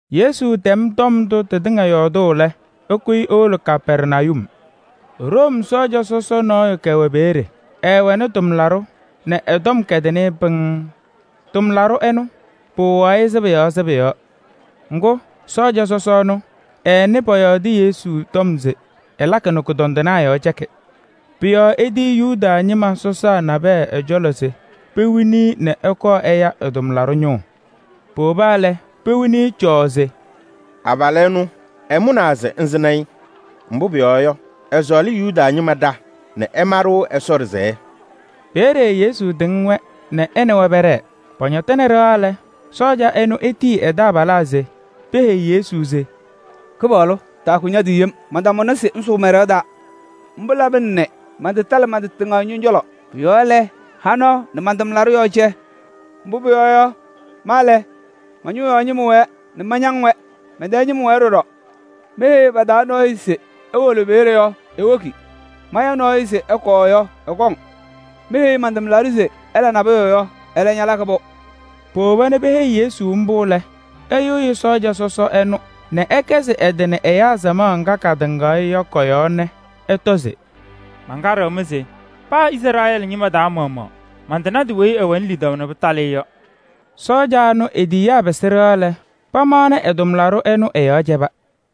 Yesu tɛm tɔm ndʋ tɩtɩŋa yɔɔdʋʋ lɛ, ɛkʋyɩ ewolo Kapɛrnayum. Room sɔɔja sɔsɔ nɔɔyʋ kɛwɛ peeye. Ɛɛwɛnɩ tʋmlaɖʋ nɛ ɛ-tɔm kɛdɩnɩ-ɩ pɩŋŋ. Tʋmlaɖʋ ɛnʋ, pɩwɩɣaɣ-ɩ sɩbʋ yɔɔ sɩbʋ yɔɔ. Ŋgʋ, sɔɔja sɔsɔ ɛnʋ, ɛɛnɩ pɔyɔɔdɩ Yesu tɔm se ɛlakɩ nɛ kʋdɔndɩnaa yɔɔ cɛkɩ. Pʋ-yɔɔ etiyi Yuda ñɩma sɔsaa nabɛyɛ ɛ-cɔlɔ se pewini-i nɛ ɛkɔɔ ɛya ɛ-tʋmlaɖʋ ñʋʋ. Powoba lɛ, pewini-i cɔɔɔ se: “Abalʋ ɛnʋ ɛmʋnaa se ŋsɩnɩ-ɩ. Mbʋ pʋyɔɔ yɔ, ɛsɔɔlɩ Yuda ñɩma ɖa nɛ ɛma-ɖʋ Ɛsɔ ɖɩsɛyɛ.” Peeye Yesu tɩŋ-wɛ nɛ ɛ nɛ wɛ pɛɖɛɛ. Pɔñɔtɩnɩ ɖɩɣa lɛ, sɔɔja ɛnʋ etiyi ɛ-taabalaa se peheyi Yesu se: “Kɩpaɣlʋ, taakʋ ña-tɩ yem, mantamʋna se ŋsʋʋ man-ɖɩɣa taa. Mbʋ labɩna nɛ mantatalɩ man-tɩ tɩŋa ñɔ-cɔlɔ. Pʋ-yɔɔ lɛ, ha nɔɔ nɛ man-tʋmlaɖʋ yɔɔ cɛ. Mbʋ pʋyɔɔ yɔ, ma lɛ, ma-ñʋʋ yɔɔ ñɩma wɛɛ nɛ mañaŋ-wɛ, mɛn-tɛɛ ñɩma wɛɛ ɖɔɖɔ. Meheyi pa-taa nɔɔyʋ se ewolo peeye yɔ yɔ, ewoki. Maya nɔɔyʋ se ɛkɔɔ yɔ, ɛkɔŋ. Meheyi man-tʋmlaɖʋ se ɛla nabʋyʋ yɔ, ɛlɛ ñalakɩ-pʋ.” Powoba nɛ peheyi Yesu mbʋ lɛ, ɛyɩɣyɩ sɔɔja sɔsɔ ɛnʋ nɛ ɛkɛzɩ ɛ-tɩ nɛ ɛyaa samaɣ ŋga katɩŋaɣ-ɩ yɔ kɔ-yɔɔ nɛ ɛtɔ se: “Mankaɖɩɣ-mɩ se paa Izrɛɛlɩ ñɩma taa maɣmaɣ, mantanadɩ weyi ɛwɛnɩ lidaʋ nɛ pɩtalɩ-ɩ yɔ.” Sɔɔja ɛnʋ e-tiyiyaa pɩsɩ ɖɩɣa lɛ, pamaɣnɩ ɛ-tʋmlaɖʋ ɛnʋ ɛ-yɔɔ cɛba.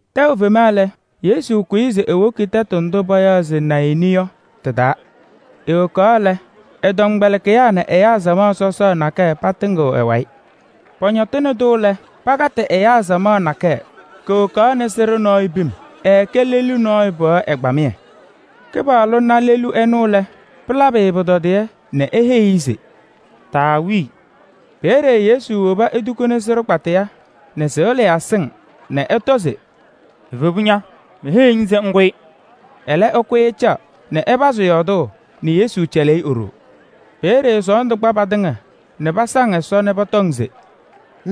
Tɛʋ fema lɛ, Yesu kʋyɩ se ewoki tɛtʋ ndʋ payaɣ se Nayɩnɩ yɔ tɩ-taa. Ewokaɣ lɛ, ɛ-tɔmkpɛlɩkɩyaa nɛ ɛyaa samaɣ sɔsɔɔ nakɛyɛ patɩŋɩɣ ɛ-wayɩ. Pɔñɔtɩnɩ-tʋ lɛ, pakatɩ ɛyaa samaɣ nakɛyɛ, kowokaɣnɩ sɩɖʋ nɔɔyʋ pim, ɛɛkɛ lelu nɔɔyʋ pɩɣa ɛgbamɩyɛ. Kɩpaɣlʋ na lelu ɛnʋ lɛ, pɩlabɩ-ɩ pʋtɔdɩyɛ nɛ eheyi-i se: “Taawii!” Peeye Yesu woba etukuni sɩɖʋ kpataya nɛ sɩɣlɩyaa sɩŋ nɛ ɛtɔ se: “Evebu ña! Meheyiɣ-ŋ se ŋkʋyɩ!” Ɛlɛ ɛkʋyɩ ɛcaɣ nɛ ɛpazɩ yɔɔdʋʋ nɛ Yesu cɛlɩ-ɩ e-ɖoo. Peeye sɔɔndʋ kpa patɩŋa nɛ pasaŋ Ɛsɔ nɛ pɔtɔŋ se: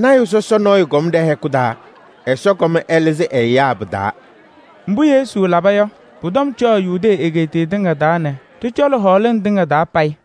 “Lɔɔyaɣ tʋ sɔsɔ nɔɔyʋ kɔm ɖɛ-hɛkʋ taa, Ɛsɔ kɔm ɛlɩzɩ ɛ-ɛyaa pɩ-taa.” Mbʋ Yesu laba yɔ, pʋ-tɔm cɔɔ Yudee egeetiye tɩŋa taa nɛ ɖɩ-cɔlɔ hɔɔlɩŋ tɩŋa taa payɩ.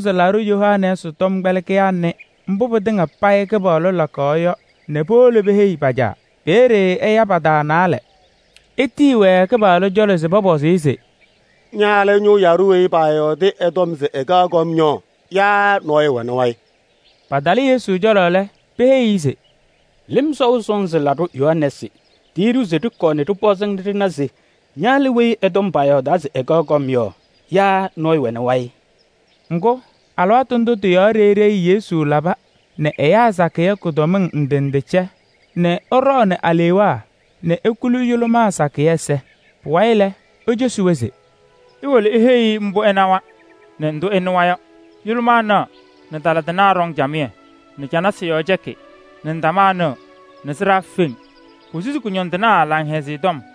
Yohanɛɛsɩ tɔmkpɛlɩkɩyaa nɩ mbʋ pɩtɩŋa payɩ Kɩpaɣlʋ lakaɣ yɔ lɛ, powolo peheyi-i. Peeye ɛya pa-taa naalɛ nɛ etiyi-wɛ ɛ-cɔlɔ se pɔpɔzɩ-ɩ nɛ pana se ɛnʋ lɛ weyi ɛ-tɔm paayɔɔdaa se ɛkaɣ kɔm yɔ yaa nɔɔyʋ wɛnɩ wayɩ? Patalɩ Yesu cɔlɔ lɛ, peheyi-i se: “Lɩm Sɔʋ Sɔnzɩ Laɖʋ Yohanɛɛsɩ tiyi-ɖʋ se ɖɩkɔɔ ɖɩpɔzɩ-ŋ nɛ ɖɩna se ña lɛ weyi ɛ-tɔm paayɔɔdaa se ɛkaɣ kɔm yɔ yaa nɔɔyʋ wɛnɩ wayɩ?” Ŋgʋ, alɩwaatʋ ndʋ tɩ-yɔɔ ɖeyi ɖeyi Yesu laba nɛ ɛyaa sakɩyɛ kʋdɔmɩŋ ndɩ ndɩ cɛ nɛ ɛɖɔɔnɩ alewaa nɛ ekuli yʋlʋmaa sakɩyɛ ɛza. Pʋwayɩ lɛ, ecosi-wɛ se: “Iwolo iheyi-i mbʋ ɩnawa nɛ ndʋ ɩnɩwa yɔ: yʋlʋmaa naɣ nɛ tala tɩnaa ɖɔŋ camɩyɛ nɛ canasɩ yɔɔ cɛkɩ nɛ ndamaa nɩɣ nɛ sɩɖaa feŋ, posusi kʋñɔndɩnaa Laŋhɛzɩyɛ Tɔm.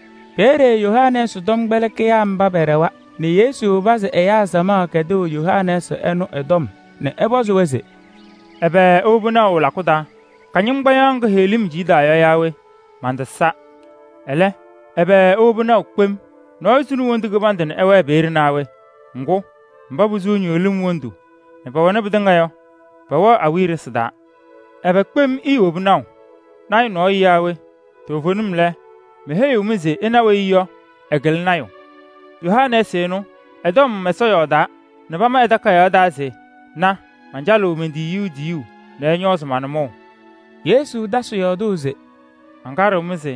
Peeye Yohanɛɛsɩ tɔmkpɛlɩkɩyaa mba pɛɖɛwa nɛ Yesu pazɩ ɛyaa samaɣ kɛdʋʋ Yohanɛɛsɩ ɛnʋ ɛ-tɔm nɛ ɛpɔzɩ-wɛ se: “Ɛbɛ iwobi naʋ lakʋ taa? Kɩñɩŋgbaɖɛ nɖɩ heɣlim ciɣdaɣ yɔ yaa we? Mantasa. Ɛlɛ, ɛbɛ iwobi naʋ kpem? Nɔɔyʋ suni wondu kɩbandʋ nɛ ɛwɛɛ peeye naa we? Ŋgʋ, mba posuu ñɩɣlɩm wondu nɛ pɛwɛnɩ pɩtɩŋa yɔ, pɛwɛɣ awiya ɖɩsɩ taa. Ɛbɛ kpem iiwobi naʋ? Lɔɔyaɣ tʋ nɔɔyʋ yaa we? Toovenim lɛ, meheyiɣ-mɩ se ɩna weyi yɔ, ɛkɩlɩ lɔɔyaɣ tʋ. Yohanɛɛsɩ ɛnʋ, ɛ-tɔm Ɛsɔ yɔɔdaa nɛ pama ɛ-Takayaɣ taa se: ‘Na! Mancalɩɣ men-tiyiyu tiyuu nɛ ɛñɔɔzɩ ña-nʋmɔʋ.’” Yesu tasɩ yɔɔdʋʋ se: “Mankaɖɩɣ-mɩ se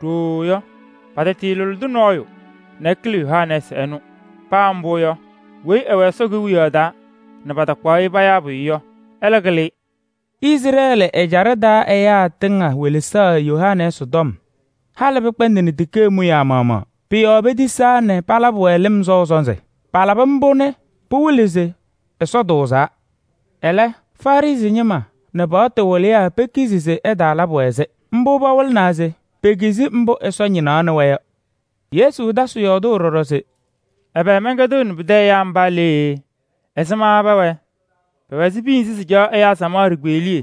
ɖooo yɔ, patalʋlɩdɩ nɔɔyʋ nɛ ɛkɩlɩ Yohanɛɛsɩ ɛnʋ. Paa mbʋ yɔ, weyi ɛwɛ Ɛsɔ Kewiyaɣ taa nɛ patakpaɣ-ɩ payaa pʋyʋ yɔ, ɛlɛ kɩlɩ-ɩ. Izrɛɛlɩ ɛjaɖɛ taa ɛyaa tɩŋa welesaɣ Yohanɛɛsɩ tɔm, halɩ pɩkpɛndɩnɩ tikee mʋyaa maɣmaɣ. Pʋ-yɔɔ petisaa nɛ palabɩ-wɛ lɩm sɔʋ sɔnzɩ. Palabɩ mbʋ nɛ pɩwɩlɩ se Ɛsɔ tʋʋzaa. Ɛlɛ, Farɩsɩ ñɩma nɛ paɣtʋ wɩlɩyaa pekizi se ɛtaalabɩ-wɛ-sɩ. Mbʋ pawɩlɩnaa se pekizi mbʋ Ɛsɔ ñɩnaɣnɩ-wɛ yɔ.” Yesu tasɩ yɔɔdʋʋ ɖɔɖɔ se: “Ɛbɛ mɛnkɛdɩɣnɩ pɩtɛ ɛyaa mba lee? Ɛzɩma pɛwɛɛ? Pɛwɛ ɛzɩ piya nzɩ sɩcaɣ ɛyaa samaɣ ɖikpeɣliye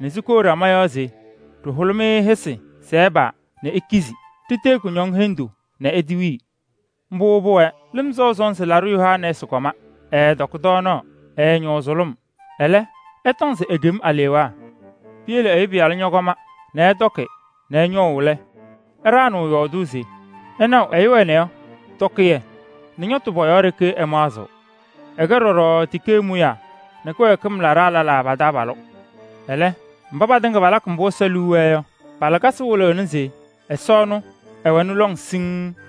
nɛ sikou ɖama yɔɔ se: ‘Ɖɩhʋlɩ-mɩ hɩsɩ se ɩpaa nɛ ikizi. Ɖitee kʋñɔŋ hendu nɛ itewii.’ Mbʋ pʋwɛɛ: ‘Lɩm Sɔʋ Sɔnzɩ Laɖʋ Yohanɛɛsɩ kɔma, ɛɛtɔkɩ tɔɔnaɣ, ɛɛñɔʋ sʋlʋm. Ɛlɛ, ɩtɔŋ se ekem alewaa.’ Piyele Ɛyʋ Pɩyalʋ ñɔkɔma nɛ ɛtɔkɩ nɛ ɛñɔʋ lɛ, ɩɖaɣnɩɣ yɔɔdʋʋ se: ‘Ɩnaɣʋ ɛyʋ ɛnɛ yɔ, tɔkɩyɛ nɛ ñɔtʋ pɔ-yɔɔ ɖeke ɛmaɣzɩɣ. Ɛkɛ ɖɔɖɔ tikee mʋyaa nɛ kɩwɛɛkɩm laɖaa lɛlaa pa-taabalʋ.’ Ɛlɛ, mba patɩŋa palakɩ mbʋ Ɛsɔ liu wɛɛ yɔ, pa-lakasɩ wɩlɩɣnɩ se ɛwɛnɩ lɔŋ siŋŋ.”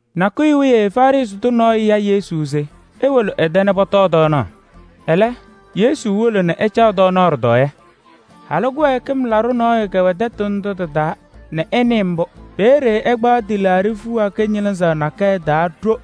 Nakʋyʋ wiye Farɩsɩ tʋ nɔɔyʋ ya Yesu se ewolo ɛ-tɛ nɛ pɔtɔɔ tɔɔnaɣ. Ɛlɛ Yesu wolo nɛ ɛcaɣ tɔɔnaɣ ɖɩtɔɔyɛ. Halʋ kɩwɛɛkɩm laɖʋ nɔɔyʋ kɛwɛ tɛtʋ ndʋ tɩ-taa nɛ ɛnɩɩ mbʋ. Peeye ɛkpaɣ tɩlaaɖɩ fiɣa kɩñɩlɩzaɣ nakɛyɛ taa ɖo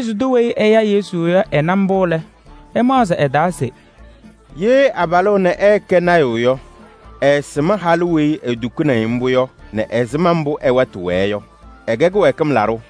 Farɩsɩ tʋ weyi ɛya Yesu yɔ, ɛna mbʋ lɛ, ɛmaɣzɩ ɛ-taa se: “Ye abalʋ ɛnɛ ɛɛkɛ lɔɔyaɣ tʋ yɔ, ɛɛsɩm halʋ weyi etukuuni-i mbʋ yɔ nɛ ɛzɩma mbʋ ɛ-wɛtʋ wɛɛ yɔ: ɛkɛ kɩwɛɛkɩm laɖʋ.”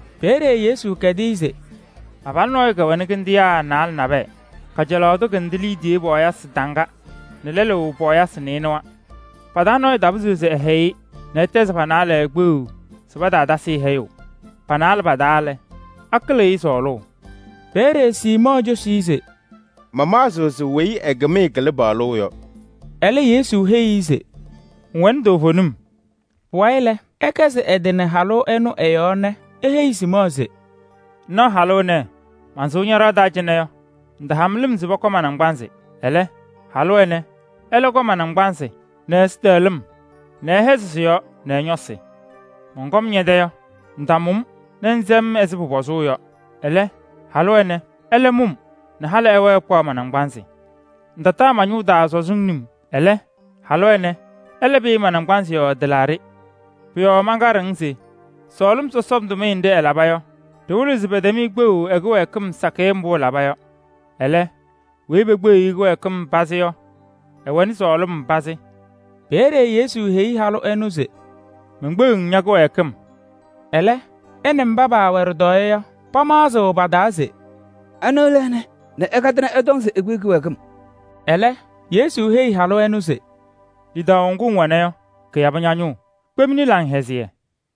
Peeye Yesu kɛdɩ-ɩ se: “Abalʋ nɔɔyʋ kɛwɛnɩ kɩndɩnaa naalɛ nabɛyɛ: kajalaɣ tʋ kɩndɩ liidiye pɔɔyɩsɩ taŋga nɛ lɛlʋ pɔɔyɩsɩ nɩɩnʋwa. Pa-taa nɔɔyʋ tapɩzɩɣ se ɛhɛyɩ-ɩ nɛ ɛtɛzɩ pa-naalɛ kpeɣu se pataatasɩ-ɩ hɛyʋʋ. Pa-naalɛ pa-taa lɛ, akɩlɩɣ-ɩ sɔɔlʋʋ?” Peeye Siimɔɔ cosi-i se: “Mamaɣzɩɣ se weyi ɛ-kɩmɩyɛ kɩlɩ paɣlʋʋ yɔ.” Ɛlɛ Yesu heyi-i se: “Ŋwɛnɩ toovenim.” Pʋwayɩ lɛ, ɛkɛzɩ ɛ-tɩ nɛ halʋ ɛnʋ ɛ-yɔɔ nɛ eheyi Siimɔɔ se: “Ŋnaɣ halʋ ɛnɛ? Mansʋʋ ña-ɖɩɣa taa cɩnɛ yɔ, ŋtaha-m lɩm se pɔkɔ ma-naŋgbanzɩ. Ɛlɛ, halʋ ɛnɛ ɛlɛ kɔ ma-naŋgbanzɩ nɛ ɛ-ɛzɩtɛɣlɩm nɛ ɛhɛzɩ sɩ-yɔɔ nɛ ɛ-ñɔsɩ. Mɔnkɔm ñɛ-tɛ yɔ, ŋtamʋ-m nɛ ŋsɛ-m ɛzɩ pʋpɔzʋʋ yɔ. Ɛlɛ, halʋ ɛnɛ ɛlɛ mʋ-m nɛ halɩ ɛwɛɛ ɛkpaɣ ma-naŋgbanzɩ. Ŋtataa ma-ñʋʋ taa sɔzɩŋ num. Ɛlɛ, halʋ ɛnɛ ɛlɛ pɩyɩ ma-naŋgbanzɩ yɔɔ tɩlaaɖɩ. Pʋ-yɔɔ mankaɖɩɣ-ŋ se sɔɔlɩm sɔsɔm tʋmɩyɛ nɖɩ ɛlaba yɔ, ɖɩwɩlɩɣ se pɛtɛm-ɩ kpeɣu ɛ-kɩwɛɛkɩm sakɩyɛ mbʋ ɛlaba yɔ. Ɛlɛ, weyi pekpeɣiɣ-i kɩwɛɛkɩm pazɩ yɔ, ɛwɛɣnɩ sɔɔlɩm pazɩ.” Peeye Yesu heyi halʋ ɛnʋ se: “Menkpeɣ-ŋ ña-kɩwɛɛkɩm.” Ɛlɛ ɛ nɛ mba paawɛ ɖɩtɔɔyɛ yɔ, pamaɣzɩɣ pa-taa se: “Anɩ lɛ ɛnɛ nɛ ɛkatɩ nɛ ɛtɔŋ se ekpeɣ kɩwɛɛkɩm?” Ɛlɛ Yesu heyi halʋ ɛnʋ se: “Lidaʋ ŋgʋ ŋwɛna yɔ, kɩyabɩ ña-ñʋʋ. Kpemni laŋhɛzɩyɛ.”